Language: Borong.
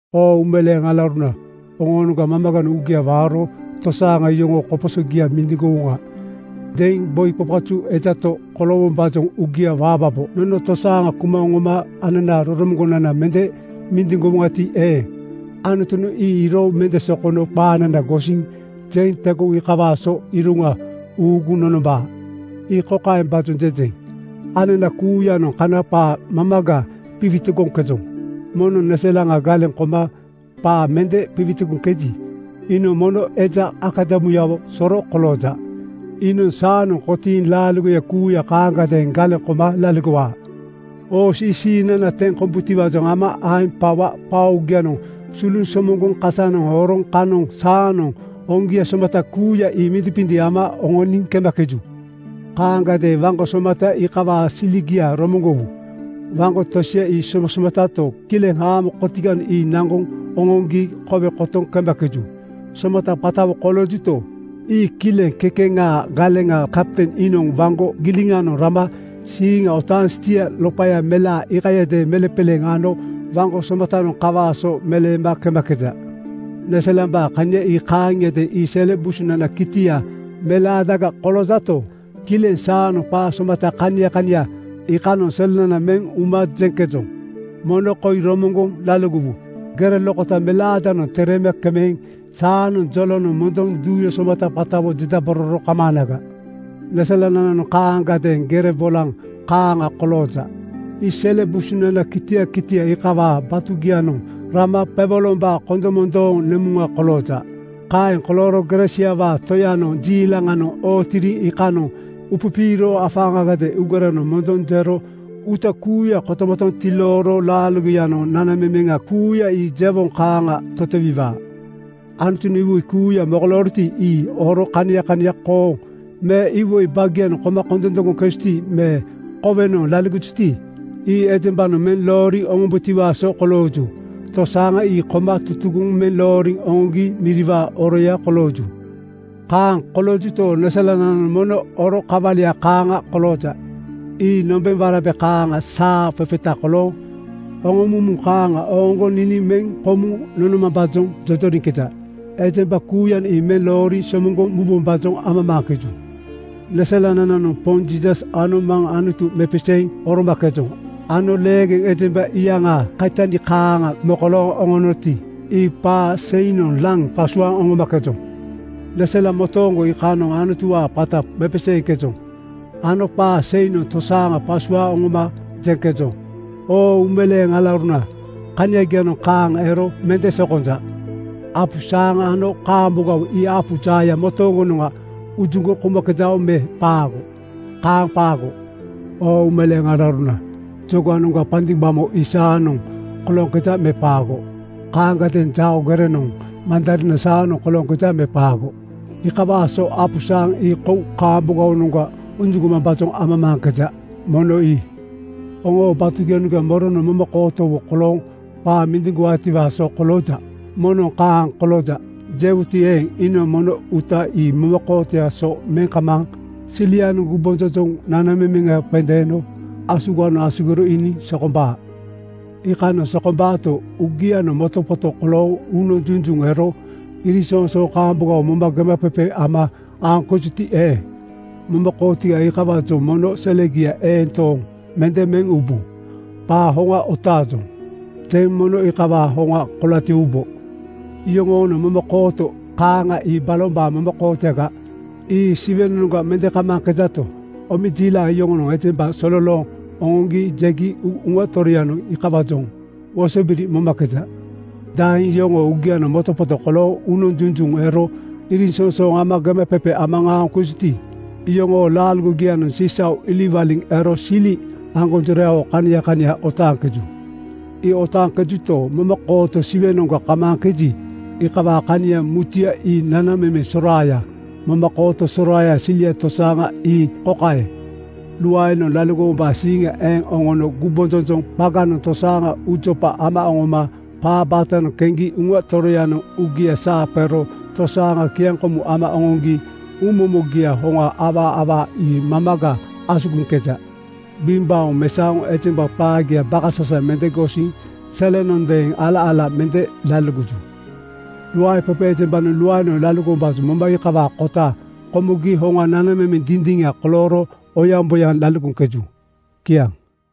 Oo uumeleeŋ alauruna, oŋoonoŋga mamaganoŋ uugia waaro “Tosaaŋa yoŋoonoŋ koposo mindiŋgowoŋa,” jeŋ boi qaqazu, eja to koloowombaajoŋ uugia waambabo. Nono tosaaŋa kuma oŋoma ananaa roromoŋgonana mende mindiŋgowoŋati eeŋ, Anutunoŋ ii iiro mende sokono qaanana gosiŋ kotakota jeŋ tegoŋ iikawaa so iroŋa uuguŋ nonombaa. Ii kokaembaajoŋ jejeŋ: Anana kuuyanoŋ kana qaa mamaga qiwitigoŋkejoŋ. Moŋnoŋ neselaŋa galeŋ koma qaa mende qiwitigoŋkeji, iinoŋ mono eja akadamuyawo soro kolooja. Iinoŋ saanoŋ kotiiŋ laaligoya kuuya kaaŋagadeeŋ galeŋ koma laligowaa. Hoos ii siiŋnana teŋ kombutiwaajoŋ ama aeŋ qawa qaa oogianoŋ suluŋ somoŋgoŋ kasanoŋ horoŋ kanoŋ saanoŋ hoŋgia somata kuuya ii mindiŋqindiŋ ama oŋoniŋ kemakeju. Kaaŋagadeeŋ waŋgo somata iikawaa siligia romoŋgowu. Waŋgo tosia ii somasomatato, kileŋ haamo kotiganoŋ ii naŋgoŋ oŋoŋgi kowe kotoŋ kemakeju. Somata qatawo koloojuto, ii kileŋ kekeŋaa galeŋa kapten iinoŋ waŋgo giliŋanoŋ rama siiŋa otaaŋ stia (steer) loqaya melaa iikayadeeŋ meleŋqeleeŋ ano waŋgo somatanoŋ kawaa so meleema kemakeja. Neselambaa kania ii kaaŋiadeeŋ. Ii sele busunanaa kitia melaadaga koloojato, kileŋ saanoŋ qaa somata kania kania iikanoŋ selenana meŋ uma jeŋkejoŋ. Mono koi romoŋgoŋ laligowa: Gere lokota melaadanoŋ tereema kemeŋ saanoŋ jolonoŋ mondoŋ duuya somata qatawo jedabororo kamaanaga. Neselanananoŋ kaaŋagadeeŋ gere bolaŋ kaaŋa kolooja. Ii sele busunanaa kitia kitia iikawaa batugianoŋ rama qewolombaa kondomondoo nemuŋa kolooja. Kaeŋ kolooro gere siawaa Toyanoŋ jiilaŋanoŋ ootiriŋ iikanoŋ upipiiro afaaŋagadeeŋ uugerenoŋ mondoŋ jero uuta kuuya kotomotoŋ tilooro laaligoyanoŋ nanamemeŋa kuuya ii jewoŋ kaaŋa totowiwaa. Anutunoŋ iwoi kuuya mokolooroti, ii oro kania kania, kooŋ me iwoi baagianoŋ koma kondondoŋgoŋkejuti me kowenoŋ laligojuti, ii ejembanoŋ meŋ looriŋ oŋombutiwaa so kolooju. Tosaaŋa ii koma tutugoŋ meŋ looriŋ oŋoŋgi miriwaa oroya kolooju. Kaaŋ koloojuto, neselanananoŋ mono oro kawalia kaaŋa kolooja. Ii nombeŋ warabe kaaŋanoŋ saa qeqeta kolooŋ oŋomumu kaaŋa oŋoŋgoŋ niniŋ meŋ komuŋ nonomambaajoŋ jojoriŋkeja. Ejemba kuuyanoŋ ii meŋ looriŋ somoŋgoŋ mubombaajoŋ amamaaŋkeju. Neselanananoŋ Poŋ Jiisas ano Maŋ Anutu mepeseeŋ oromakejoŋ ano leegeŋ ejemba iyaŋaa kaitani kaaŋa mokolooŋ oŋonoti, ii qaa seinoŋ laŋ qasuaaŋ oŋomakejoŋ. Neselaŋ motooŋgo iikanoŋ Anutuwaa qata mepeseeŋkejoŋ ano qaa seinoŋ tosaaŋa qasuaaŋ oŋoma jeŋkejoŋ. Oo uumeleeŋ alauruna, kaniagianoŋ kaaŋa ero mende sokonja. Apu saaŋa ano kaambogawo ii apu jaaya motooŋgonoŋa ujuŋgoŋ koumakejao me qaago? Kaaŋ qaago. Oo uumeleeŋ alauruna, jogaŋnoŋga pandigbamo (saŋ) ii saanoŋ kolooŋkeja me qaago? Kaaŋagadeeŋ jao gerenoŋga mandariina saanoŋ kolooŋkeja me qaago? Iikawaa so apu saaŋa ii kou kaambogawonoŋga ujuŋgomambaajoŋ amamaaŋkeja. Mono ii. Oŋoo batugianoŋ moronoŋ momakootowo kolooŋ qaa mindiŋgowaatiwaa so kolooja? Moŋnoŋ “Kaaŋa kolooja,” jewuti eeŋ, iinoŋ mono uuta ii momakootoyaa so meŋ kamaaŋ silianoŋ gumbonjonjoŋ nanamemeŋa qendeeno asuganoŋ asugiro iiniŋ sokombaa. Iikanoŋ sokombaato, uugianoŋ motoqoto kolooŋ uunoŋ junjuŋ ero iriŋsoŋsooŋ kaambogawo moma gemaqeqe ama aoŋkejuti eeŋ, momakootogia iikawaajoŋ mono selegia eeŋ tooŋ mende meŋ ubu. “Qaa hoŋa otaajoŋ,” jeŋ mono iikawaa hoŋa kolatiwubo. Yoŋoo-noŋ momakooto kaaŋa ii balombaa momakootoyaga. Ii Siwenoŋga mende kamaaŋkejato, omejiilaŋ yoŋonoŋ ejemba sololooŋ oŋoŋgi jegi Uŋa Toroyanoŋ iikawaajoŋ wosobiri momakeja. Daeŋ yoŋoo uugianoŋ motoqoto kolooŋ uunoŋ junjuŋ ero iriŋsoŋsooŋ moma gemaqeqe ama aoŋkejuti, iyoŋoo laaligogianoŋ sisau iliŋwaliŋ ero sili aŋgonjorayawo kania kania otaaŋkeju. Ii otaaŋkejuto, momakooto Siwenoŋga kamaaŋkeji, iikawaa kania mutuya ii nanamemeŋ soraaya. Momakooto soraayaa silia tosaaŋa ii kokaeŋ: Luaenoŋ laligowombaa siiŋa eŋ oŋono gumbonjonjoŋ qaganoŋ tosaaŋa uujopa ama oŋoma qaa baatanoŋ keŋgi Uŋa Toroyanoŋ uugia saa qero tosaaŋa kiaŋkomuŋ ama oŋoŋgi uumomogiaa hoŋa awaa awaa ii mamaga asugiŋkeja. Gbiŋgbaoŋ mesaoŋ ejemba qaagia bakasasaŋ mende gosiŋ selenondeeŋ ala-ala mende laligoju. Luaeqeqe ejembanoŋ luaenoŋ laligowombaajoŋ moma iikawaa kota komogi hoŋa nanamemeŋ dindiŋa kolooro oyaŋboyaŋ laligoŋkeju. Kiaŋ.